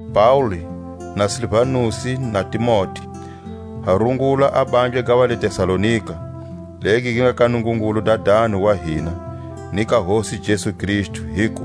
Paule, na Silvanusi, na Timote, ha rungula a bandla ga va le Tesalonika, legi gi nga ka Nungungulu Dadani wa hina, ni ka Hosi Jesu Kristu, hiku: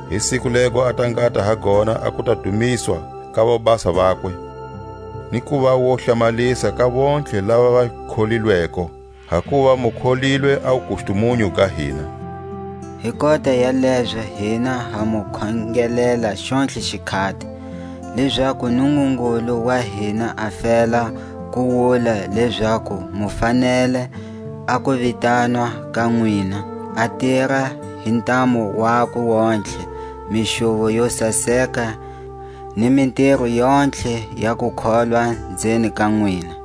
hi siku lego a ta ngata ha gona a kuta dumiswa ka vobasa vakwe, ni kuva wo hlamalisa ka vontlhe lava va kholilweko; hakuva mu kholilwe a wukustumunyu ga hina. Hi kota ya lezo hina ha mu khongelela xontlhe xikhati, lezaku a Nungungulu wa hina a fela ku wula lezaku mu fanele a kuvitanwa ka nwina, a tira hi ntamu wakwe yontlhe mixuvo yo saseka ni mitiro yontlhe ya kukholwa nzeni ka nwina;